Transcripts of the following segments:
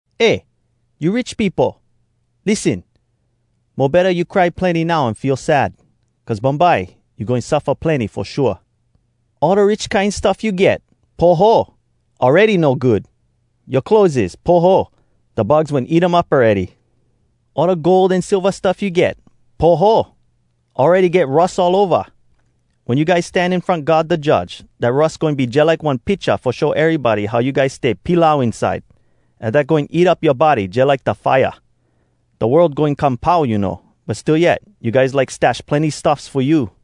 Eh! You rich peopo! Lissen! Mo betta you cry plenny now, an feel sad! Cuz bumbye, you goin suffa plenny fo shua. All da rich kine stuff you get, poho! awready no good. Yoa clotheses, poho! da bugs wen eat um up awready. All da gold an silva stuff you get, poho! awready get rus all ova. Wen you guys stan in front God da Judge, dat rus goin be jalike one picha fo show erybody how you guys stay pilau inside, an dat goin eat up yoa body jalike da fire. Da world goin come pau, you know! But still yet, you guys like stash plenny stuffs fo you!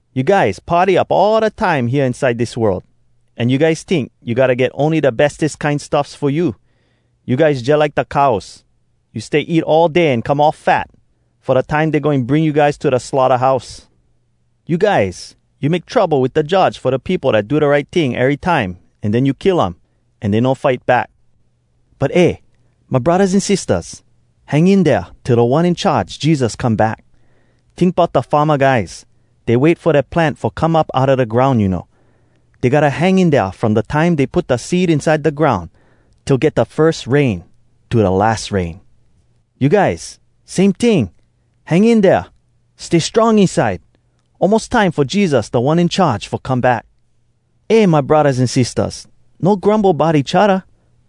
You guys party up all da time hea inside dis world, an you guys tink you gotta get ony da bestes kine stuffs fo you. You guys jalike da cows. You stay eat all day an come all fat, fo da time dey goin bring you guys to da slaughterhouse! You guys, you make trouble wit da judge fo da peopo dat do da right ting erytime, an den you kill um. An dey no fight back. But eh, my braddahs an sistahs! Hang in dea, till Da One In Charge, Jesus, come back. Tink bout da farma guys. Dey wait fo dea plant fo come up outa da groun, you know. Dey gotta hang in dea from da time dey put da seed inside da groun, till get da firs rain, to da las rain. You guys, same ting. Hang in dea! Stay strong inside! Almos time fo Jesus Da One In Charge fo come back. Eh my braddahs an sistahs, no grumble bout each odda.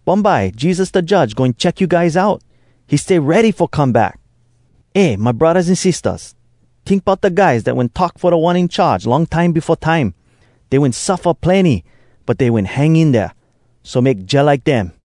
Bumbye Jesus da Judge goin check you guys out. He stay ready fo come back! Eh my braddahs an sistahs! Tink bout da guys dat wen talk fo Da One In Charge long time befo time. Dey wen suffa plenny, but dey wen hang in dea. So, make jalike dem.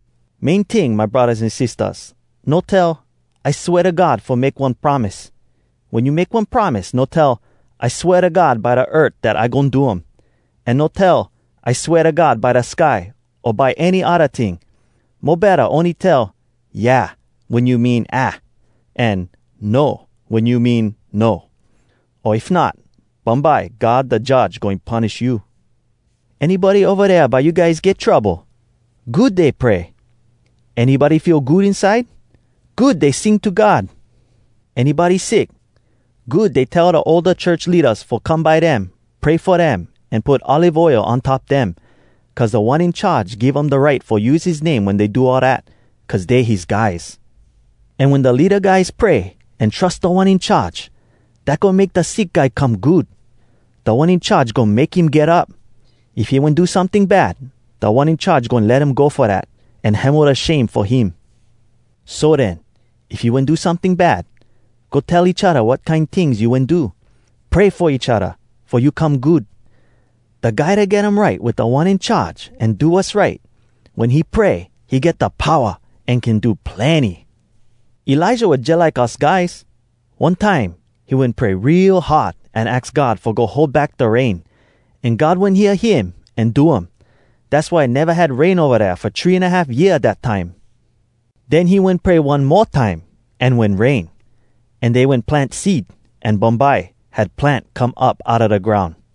Main ting, my braddahs an sistahs, no tell, “I swea to God fo make one promise.” Wen you make one promise, no tell “I swea to God by da earth dat I goin do um.” An no tell “I swea to God by da sky” o by any odda ting. Mo betta, ony tell “Yeah” wen you mean aah, an “No” wen you mean no. O if not, bumbye God da Judge goin punish you. Anybody ova dea by you guys get trouble? Good dey pray! Anybody feel good inside? Good dey sing to God! Anybody sick? Good dey tell da older church leadas fo come by dem, pray fo dem, an put olive oil on top dem, cuz Da One In Charge give um da right fo use his name wen dey do all dat, cuz dey his guys. An wen da leada guys pray an trus Da One In Charge, dat goin make da sick guy come good. Da One In Charge goin make him get up. If he wen do someting bad, Da One In Charge goin let um go fo dat, an hemo da shame fo him. So den, if you wen do someting bad, go tell each odda wat kine tings you wen do. Pray fo each odda, fo you come good. Da guy dat get um right wit Da One In Charge an do wass right, wen he pray he get da powa an can do plenny. Elijah was jalike us guys. One time, he wen pray real hard an aks God fo go hold back da rain. An God wen hear him an do um. Dass why neva had rain ova dea fo three an a half year, dat time. Den he wen pray one mo time, an wen rain. An dey wen plant seed, an bumbye, had plant come up outa da groun.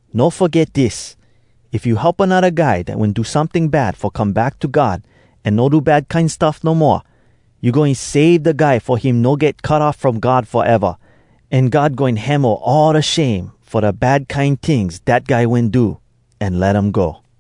No foget dis: if you help anodda guy dat wen do someting bad fo come back to God an no do bad kine stuff no moa, you goin save da guy fo him no get cut off from God foeva, an God goin hemo all da shame fo da bad kine tings dat guy wen do, an let um go.